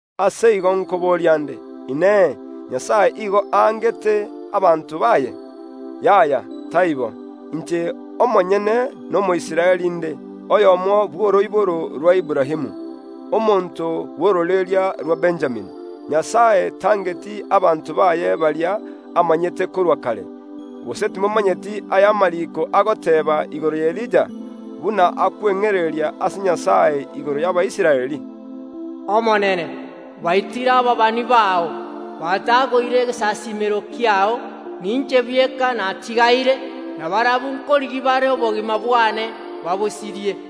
Ase igo nkoboria ’nde: Inee! Nyasae nigo angete abanto baye? Yaya, taibo! Inche omonyene n’Omoisraeli inde, oyomo bw’oroiboro rwa Aburaamu, omonto bw’ororeria rwa Benjamini. Nyasae tangeti abanto baye baria amanyete korwa kare. Gose timomanyeti aya amariiko agoteeba igoro y’Elija, buna akweng’ereria ase Nyasae igoro y’Abaisraeli? “Omonene, baitire ababani bao, batagoire egesasiimero kiao, ninche bweka natigaire, na barabwo nkorigia bare obogima bwane babosirie.”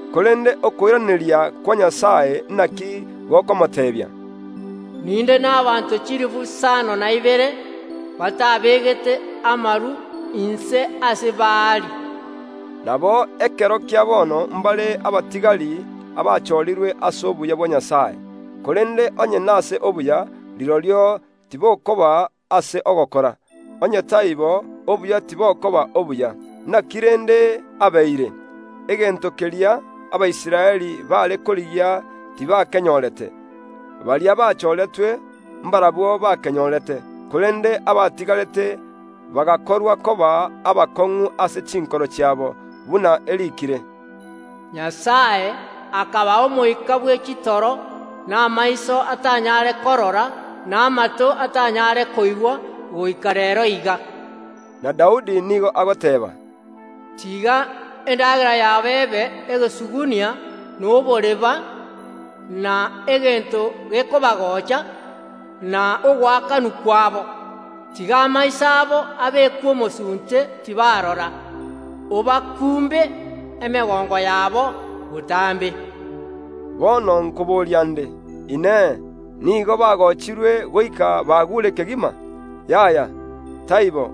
Korende okoiraneria kwa Nyasae inaki gokomoteebia? “Ninde nabaanto chilifu isano na ibere batabegete amaru inse ase Baali.” Nabo ekero kia bono ’mbare abatigari abachoorirwe ase obuya bwa Nyasae. Korende onye nase obuya, rirorio tibokoba ase ogokora, onye taibo, obuya tibokoba obuya. Inaki rende abeire? Egento keria Abaisraeli baare korigia tibakenyorete, Baria bachoretwe, mbarabwo bakenyorete, korende abatigarete bagakorwa koba abakong’u ase chinkoro chiabo, buna eriikire, “Nyasae akabaa omoika bwe chitoro, na amaiso atanyare korora, na amato atanyare koigwa, goika reero iga.” Na Daudi nigo agoteeba, “Tiga endagera yabo ebe egesugunia na oboreba, na egento gekobagocha, na ogoakanwa kwabo. Tiga amaiso abo abekwe omosunte tibarora. Obakumbe emegongo yabo botambe!” Bono nkoboria nde, “Inee! Nigo bagochirwe goika baguure kegima?” Yaya, taibo!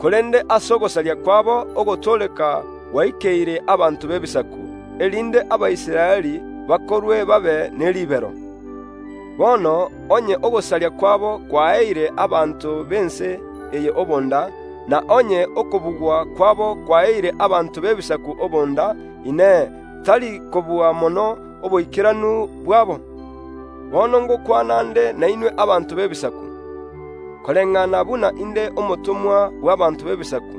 Korende ase ogosaria kwabo ogotooreka gwaikeire abanto b’Ebisaku, erinde Abaisraeli bakorwe babe ne ribero. Bono onye ogosaria kwabo kwaeire abanto b’ense eye obonda, na onye okobugwa kwabo kwaeire abanto b’Ebisaku obonda, Inee, tari kobua mono oboikeranu bwabo? Bono ’ngokwana nde nainwe abanto b’Ebisaku. Koreng’ana buna inde omotomwa bw’ abanto b’Ebisaku,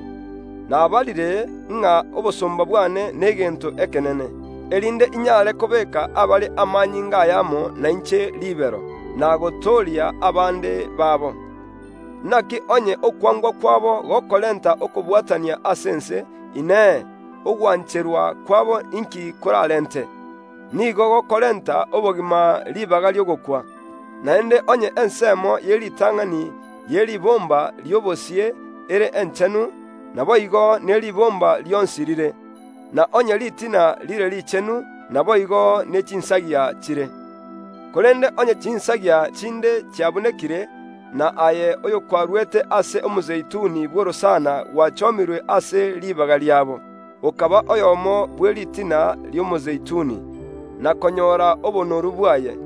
nabarire ng’a obosomba bwane n’egento ekenene, erinde inyare kobeeka abare amanyinga ayamo nainche ribero, na gotooria abande babo. Inaki onye okwangwa kwabo gokorenta okobwatania ase ense, Inee, ogwancherwa kwabo inki koraarente? Nigo gokorenta obogima ribaga ri’ogokwa. Naende onye ensemo ye ritang’ani ye ribomba ri’obosie ere enchenu, naboigo ne ribomba rionsi rire; na onye ritina rire richenu, naboigo ne chinsagia chire. Korende onye chinsagia chinde chiabunekire, na aye oyokwarwete ase omozeituni bw’orosana gwachomirwe ase ribaga riabo, okaba oyomo bwe ritina ri’omozeituni, na konyora obonoru bwaye,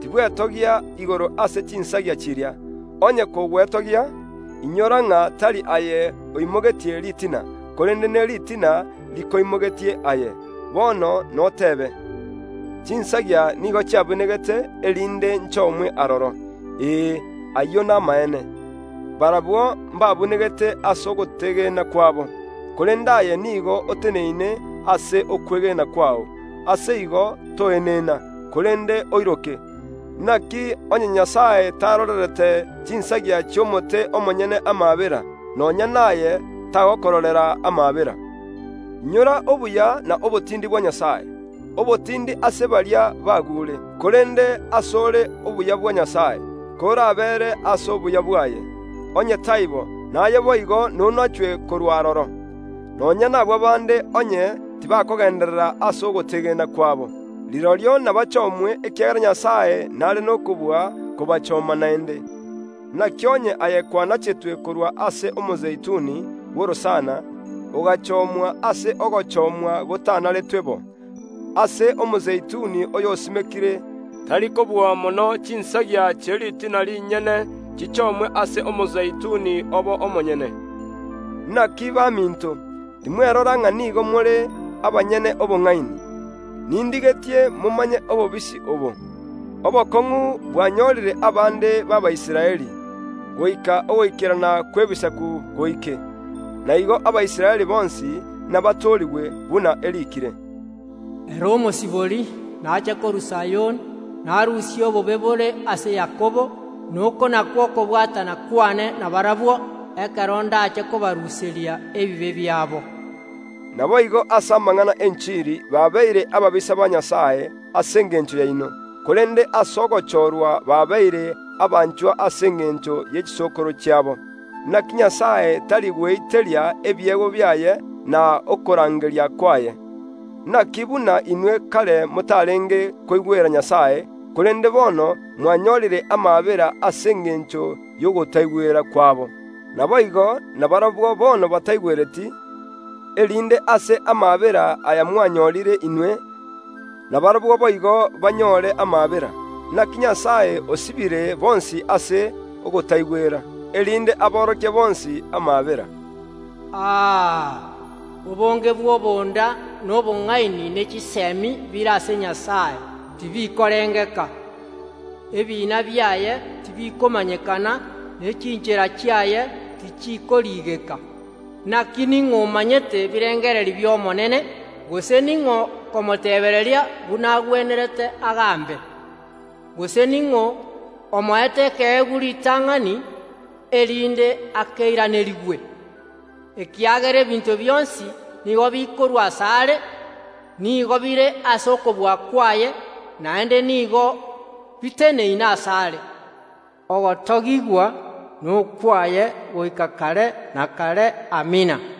tibwetogia igoro ase chinsagia chiria. Onye kogwetogia, inyora ng’a tari aye oimogetie ritina, korende neritina rikoimogetie aye. Bono noteebe, “Chinsagia nigo chiabunegete, erinde nchomwe aroro.” Ee, ayio namaene. Barabwo mbabunegete ase ogot’egena kwabo, korende aye nigo oteneine ase okwegena kwao. Ase igo toenena, korende oiroke. Inaki onye Nyasae tarorerete chinsagia chi’omote omonyene amaabera, nonya naye tagokororera amaabera. Inyora obuya na obotindi bwa Nyasae, obotindi ase baria baguure; korende ase ore obuya bwa Nyasae, korabeere ase obuya bwaye. Onye taibo, naye boigo nonachwe korwa aroro. Nonya nabwo bande, onye tibakogenderera ase ogot’egena kwabo, rirorio nabachomwe, ekiagera Nyasae n’are n’okobua kobachoma naende. Inaki onye aye kwanachetwe korwa ase omozeituni bw’orosana, ogachomwa ase ogochomwa gotanaretwe bo, ase omozeituni oy’osimekire, tari kobua mono chinsagia chie ritina rinyene chichomwe ase omozeituni obo omonyene. Inaki baminto, timwerora ng’a nigo more abanyene obong’aini; nindigetie momanye obobisi obo. Obokong’u bwanyorire abande b’Abaisraeli, goika ogoikerana kw’Ebisaku goike. Na igo Abaisraeli bonsi inabatoorigwe, buna eriikire, “Ere Omosibori naache korwa Sayoni. Narusie obobe bore ase Yakobo; na oko nakwo okobwatana kw’ane nabarabwo, ekero ’ndaache kobaruseria ebibe biabo.” Naboigo ase amanag’ana y’enchiri babeire ababisa ba Nyasae ase engencho yaino; korende ase ogochoorwa babeire abanchwa ase engencho ye chisokoro chiabo. Inaki Nyasae tari gweiteria ebiegwa biaye na okorangeria kwaye. Inaki buna inwe kare motarenge koigwera Nyasae, korende bono mwanyorire amaabera ase engencho y’ogotaigwera kwabo, naboigo na barabwo bono bataigwereti, erinde ase amaabera aya mwanyorire inwe, nabarabwo boigo banyore amaabera. Inaki Nyasae osibire bonsi ase ogotaigwera, erinde aborokie bonsi amaabera. Aa! Obonge bw’obonda, na obong’aini, ne chisemi bire ase Nyasae! Tibikorengeka. Ebiina biaye tibikomanyekana ne chinchera chiaye tichikoriigeka! “Inaki ning’o omanyete ebirengererio bia Omonene? Gose ning’o okomotebereria buna agwenerete agaambe? Gose ning’o omoete ekeegwa ritang’ani, erinde akeiranerigwe?” Ekiagera ebinto bionsi nigo bikorwa ase are, nigo bire ase okobua kwaye, naende nigo biteneine ase are. Ogotogigwa nokwaye goika kare na kare. Amina.